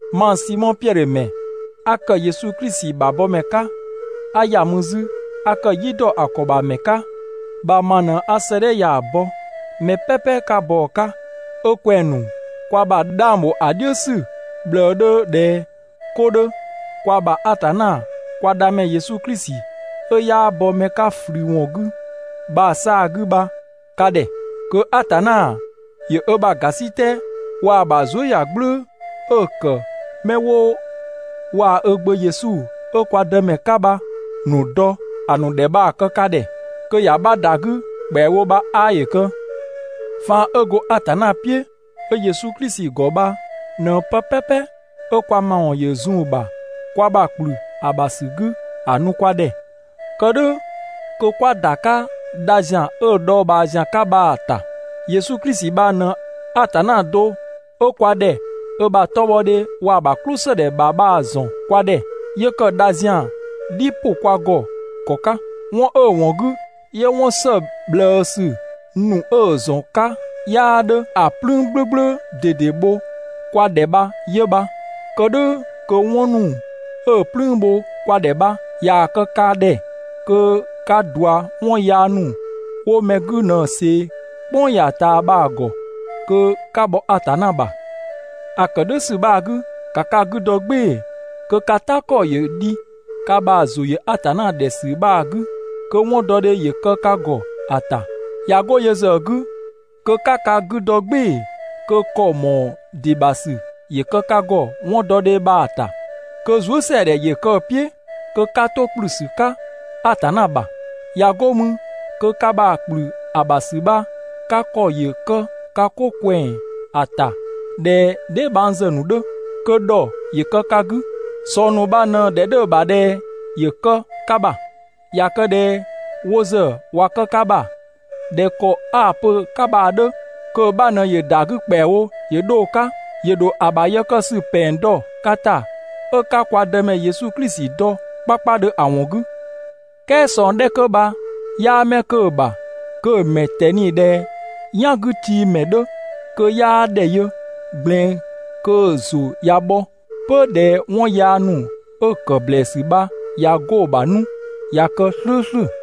Mang Simɔ Piɛdhö ‑mɛ 'a ‑kë Yesu Klisi ‑bha bɔmɛ 'ka, 'a ‑ya mü 'zü 'a ‑kë "yi ‑dɔ ‑a ‑kɔ ‑bha ‑mɛ 'ka bha ma ꞊në 'a 'sëëdhɛ ya‑ bɔ, mɛ "pɛpɛ 'ka bɔ‑ 'ka, 'ö kwɛng‑ ‑nu kwa ‑bha 'dhang bho ‑a "dhiʋ̈ ‑sü ꞊bhlëë 'dhö ꞊dhɛ 'ko 'dhö, kwa ‑bha Atanna kwa Dhamɛ Yesu Klisi 'ö 'yaa bɔ mɛ 'ka ꞊flü ‑wɔn 'gü bha‑ 'saa‑ 'gü bha ka ‑dhɛ. Kö Atanna ‑yö ö ‑bha ‑gasitɛ waa‑ ‑bha zuëyagblʋ̈ʋ̈‑ 'ö‑ ‑kë 'mɛ 'wo waa‑ ö Gbö Yesu 'ö kwa Dëmɛ 'ka bha‑ ‑nu dɔ ‑a ‑nu ‑dhɛ bha‑ kë ka ‑dhɛ, kö ‑ya 'bha ‑da 'gü ‑kpɛawo bha 'aa ‑yö kë. Faan 'ö go Atanna "piʋ̈ 'ö Yesu Klisi ‑gɔ bha ꞊në pë "pɛpɛ 'ö kwa ‑mawɔn ‑yö zun‑ ‑bha, ‑kwa ‑bha ‑kplü ‑a ‑bha ‑sü 'gü ‑a nu kwa ‑dhɛ, kë "dhʋ̈ kö 'kwa ‑da 'ka dha ‑zian 'ö‑ dhɔɔbhaa ‑zian 'ka bha‑ ‑ta. Yesu Klisi bha ꞊në Atanna do 'ö kwa ‑dhɛ ö ‑bha 'tɔbhɔdhe waa‑ ‑bha "klʋsëdhɛ ‑bha bha‑ ‑zɔn kwa ‑dhɛ, 'yö ‑kë dha ‑zian "dhi ‑pʋ kwa ‑gɔ ‑kɔ 'ka. 'Wɔn 'ö‑ ‑wɔn 'gü 'yö 'wɔn ‑së ꞊bhlëësü ‑nu 'ö‑ ‑zɔn 'ka 'yaa 'dhö ‑a "plüün "gblʋ̈gblʋ̈ ꞊dede bho kwa ‑dhɛ bha 'yö bha. Kë "dhʋ̈ kö 'wɔn ‑nu 'ö‑ "plüün bho kwa ‑dhɛ bha ꞊yaa‑ kë ka ‑dhɛ, kö 'ka ꞊dua 'wɔn yaya ‑nu 'wo mɛ 'gü ꞊në ꞊see "kpʋng ya‑ ꞊taa bha‑ ‑gɔ kö 'ka bhɔ Atanna ‑bha. ‑A ‑kë "dhʋ̈ ‑sü bha‑ 'gü, ‑ka ka 'gü dɔ "gbɩɩ‑ kö ka "ta ‑kɔ ‑yö dhi ka ‑bha ‑zʋ ‑yö Atanna ‑dhɛ ‑sü bha‑ 'gü, kö 'wɔndɔdhe ‑yö kë ka ‑gɔ ‑a ‑ta. ꞊Ya 'go yö ‑zë 'gü, kö 'ka ka 'gü dɔ "gbɩɩ‑ kö ‑kɔ ‑mɔɔ ‑dɩ ‑bha ‑sü ‑yö kë ka ‑gɔ 'wɔndɔdhe bha‑ ‑ta, kö zuësɛadhɛ ‑yö kë‑ "piʋ̈, kö 'ka 'to ‑kplü ‑sü 'ka Atanna ‑bha. ꞊Ya 'go mü kö ka ‑bha ‑kplü ‑a ‑bha ‑sü bha ka ‑kɔ ‑yö kë ka 'ko ꞊kwɛng ‑a ‑ta ꞊dhɛ dheebhangzë ‑nu 'dhö, kö ‑dhɔ ‑yö kë ka 'gü. ꞊Sɔng ‑nu bha ꞊në‑ ‑dhɛ 'dhö‑ ‑bha ꞊dhɛ ‑yö kë ka ‑bha, ꞊ya kë ꞊dhɛ wo ‑zë ꞊wa kë ka ‑bha ꞊dhɛ ‑kɔ 'a‑ pö‑ 'ka bha‑ 'dhö, kö‑ 'bha ꞊në ‑yö ‑da 'gü ‑kpɛawo ‑yö 'dho‑ 'ka, ‑yö ‑dho ‑a ‑bha yë kë ‑sü ‑pɛng dɔ ka ‑ta, 'ö 'ka kwa Dëmɛ Yesu Klisi dɔ 'kpakpadhö ‑a ‑wɔn 'gü. "Kɛɛ ꞊sɔng 'dhɛ 'kö bha 'yaa 'mɛ 'kö‑ ‑bha, kö‑ ‑mɛ ꞊tɛni ꞊dhɛ "yangütiimɛ 'dhö, kö 'yaa ‑dhɛ yö ꞊gblɛɛn, kö‑ ‑zʋ ꞊ya bhɔ 'pö ꞊dhɛ 'wɔn yaa ‑nu 'ö‑ ‑kë ‑blɛɛsü bha ꞊ya 'go‑ ‑bha 'nu, ꞊ya kë "slʋ̈ʋ̈slʋ̈.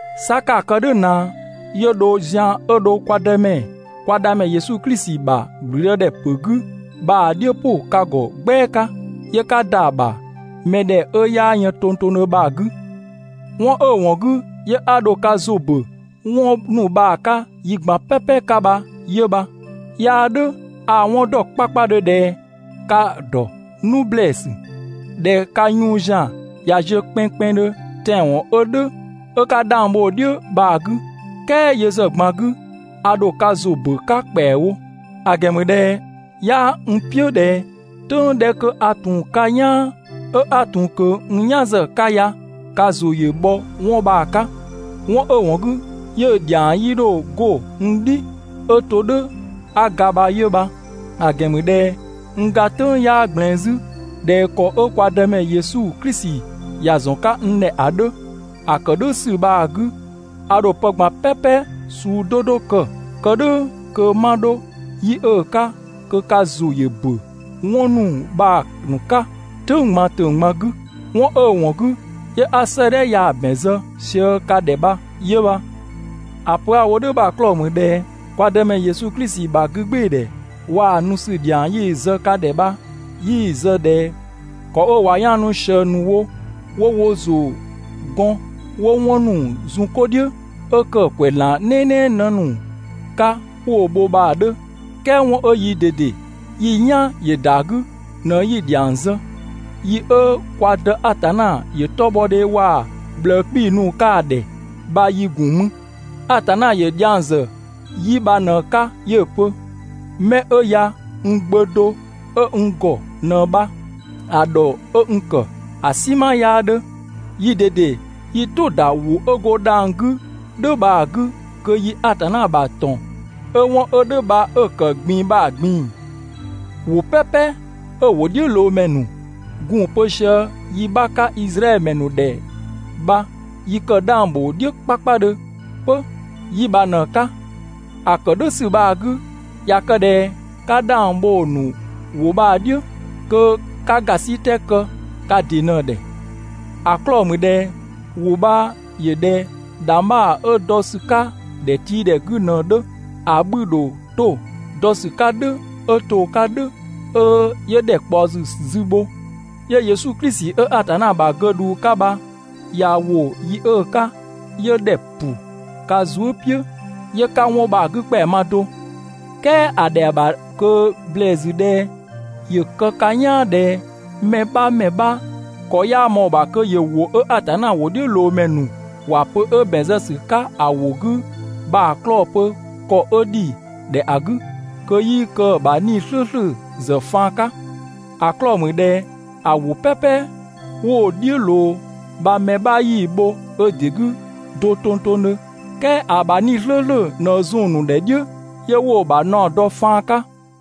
'Sa 'ka‑ kë "dhʋ̈ ꞊naa 'yö dho zian 'ö dho kwa Dëmɛ, kwa Dhamɛ Yesu Klisi ‑bha ‑gblüdëdhɛpö 'gü bha‑ "dhiʋ̈ ‑pʋ ka ‑gɔ "gbɛa 'ka, 'yö 'ka ‑da ‑bha mɛ ‑dhɛ 'ö 'yaa yën tongtongdhö bha‑ 'gü. 'Wɔn 'ö‑ ‑wɔn 'gü 'yö 'a dho ka ‑zʋ ‑bö 'wɔn ‑nu bha‑ 'ka yi ꞊gban "pɛpɛ 'ka bha 'yö bha. 'Yaa "dhʋ̈, a‑ 'wɔn ‑dɔ 'kpakpadhö ꞊dhɛ ka‑ ‑dɔ 'nu ‑blɛɛsü, ꞊dhɛ ka yun ‑zian ꞊ya ziö kpɛnngkpɛnngdhö tɛanwɔn 'ö "dhʋ̈, 'ö 'ka 'dhang bho‑ "dhiʋ̈ bha‑ 'gü, "kɛɛ yö ‑zë ꞊gban 'gü a ‑dho ka ‑zʋ ‑bö 'ka ‑kpɛawo. ‑A ‑gɛn ‑mü ꞊dhɛ 'yaa n "piʋ̈ ꞊dhɛ "tʋ̈ng 'dhɛ 'kö 'a ‑tun 'ka "yaan, 'ö 'a ‑tun kö n "yan zë‑ 'ka ya ka ‑zʋ ‑yö bhɔ 'wɔn bha‑ 'ka. 'Wɔn 'ö‑ ‑wɔn 'gü 'yö‑ ‑dhiang 'yii 'dho 'go n "dhi 'ö to "dhʋ̈ 'a ga bha 'yö bha. ‑A ‑gɛn ‑mü ꞊dhɛ n ga "tʋ̈ng 'yaa ꞊gblɛɛn 'zü ꞊dhɛ ‑kɔ 'ö kwa Dëmɛ Yesu Klisi ‑ya ‑zɔn 'ka n ‑dhɛ ‑a 'dhö. ‑A kë "dhʋ̈ ‑sü bha‑ 'gü, a ‑dho pë ꞊gban "pɛpɛ suu 'do 'do kë, kë "dhʋ̈ kö 'ma 'dho yi 'ö‑ 'ka, kö ka ‑zʋ ‑yö ‑bö 'wɔn ‑nu bha‑ ‑nu 'ka "tʋ̈ng ꞊gban ‑tʋ̈ng ꞊gban 'gü. 'Wɔn 'ö‑ ‑wɔn 'gü 'yö 'a 'sëëdhɛ ya‑ ‑bɛn zë sië ka ‑dhɛ bha 'yö bha. ‑A pö 'a‑ wo "dhʋ̈ bha‑ 'klɔɔ‑ ‑mü ꞊dhɛ kwa Dëmɛ Yesu Klisi ‑bha 'gügbɩɩdhɛ waa‑ nu ‑sü ‑dhiang 'yi‑ zë ka ‑dhɛ bha, 'yii‑ zë ꞊dhɛ ‑kɔ 'ö ꞊wa 'yaanu ꞊sië ‑nu wo, 'wo wo ‑zʋ gɔn 'wo 'wɔn ‑nu zun 'ko "dhiʋ̈ 'ö ‑kë ‑kwɛzlan "nɛɛnɛɛ 'në ‑nu 'ka 'wo‑ bho bha‑ 'dhö, "kɛɛ 'wɔn 'ö yii ꞊dede yi "yan ‑yö ‑da 'gü ꞊në 'yi‑ ‑dhiang zë. Yi 'ö kwa Dë Atanna ‑yö 'tɔbhɔdhe waa‑ ꞊bhlëë 'kpii‑ nu‑ 'ka‑ ‑dhɛ bha yi ‑gun mü. Atanna ‑yö dhiang ‑zë 'yi bha ꞊në‑ 'ka 'yö‑ pö: «'Mɛ 'ö ya, n Gbö (do) 'ö n ‑gɔ ꞊në bha, ‑a ‑dhɔ 'ö n ‑kë ‑a "sinma 'yaa 'dhö.» Yii ꞊dede yi "tʋ‑ ‑da ‑wʋ 'ö go dhang‑ 'gü "dhʋ̈ bha‑ 'gü kö yi Atanna ‑bha ‑tɔn 'ö ('wɔn 'ö "dhʋ̈ bha 'ö ‑kë ꞊gbin‑) bha‑ ꞊gbin‑. ‑Wʋ "pɛpɛ 'ö‑ ‑wʋdhiʋ̈loomɛ ‑nu gun‑ pö sië yi 'bha 'ka Izraɛdhö ‑mɛ ‑nu ‑dhɛ bha yi kë 'dhang ‑bho "dhiʋ̈ 'kpakpadhö 'pö 'yi bha ꞊në‑ 'ka. ‑A ‑kë "dhʋ̈ ‑sü bha‑ 'gü, ꞊ya kë ꞊dhɛ 'ka 'dhang bho‑ ‑nu ‑wʋ bha‑ "dhiʋ̈, kö 'ka ‑gasitɛ kë ka ‑dɩ ꞊në‑ ‑dhɛ. ‑A 'klɔɔ‑ ‑mü ꞊dhɛ ‑wʋ bha ‑yö ꞊dhɛ ‑dhangbha 'ö dɔ ‑sü 'ka ‑dhɛtiidhɛ 'gü ꞊në‑ 'dhö. ‑A 'bhü‑ ‑dho 'to dɔ ‑sü 'ka "dhʋ̈ 'ö to‑ 'ka "dhʋ̈ 'ö ‑dhɛ ‑yö ꞊kpaɔ ‑sü zü bho, 'yö Yesu Klisi 'ö Atanna ‑bha 'gödhuu 'ka bha ꞊ya ‑wo yi 'ö‑ 'ka, 'yö ‑dhɛ ‑pʋ ka zuë" "piʋ̈, 'yö 'ka 'wɔn bha‑ 'gü ‑kpɛa ma do. "Kɛɛ ‑a ‑dhɛa ‑bha ꞊kö ‑blɛɛsü ꞊dhɛ ‑yö kë ka "yaan ꞊dhɛ mɛ 'bha ‑mɛ 'bha ‑kɔ 'yaa ꞊mɔɔ‑ ‑bha kö ‑yö ‑wʋ 'ö Atanna ‑wʋdhiʋ̈loomɛ ‑nu ‑wa pö 'ö ‑bɛn zë ‑sü 'ka ‑a ‑wʋ 'gü bha‑ 'klɔɔ‑ pö ‑kɔ 'ö ‑dhi ‑dhɛ ‑a 'gü (kö 'yii kë‑ ‑bha 'Nii‑ "slʋ̈ʋ̈slʋ̈ ‑zë faan 'ka). ‑A 'klɔɔ‑ mü ꞊dhɛ ‑a ‑wʋ "pɛpɛ 'wo‑ "dhiʋ̈ ꞊loo bha mɛ 'bha 'yii‑ bho ö ‑dɩ 'gü do tongtongdhö, "kɛɛ ‑a ‑bha 'Nii‑ "slʋ̈ʋ̈slʋ̈ ꞊në zun‑ ‑nu ‑dhɛ "dhiʋ̈ 'yö 'wo‑ ‑bha naɔ dɔ‑ faan 'ka.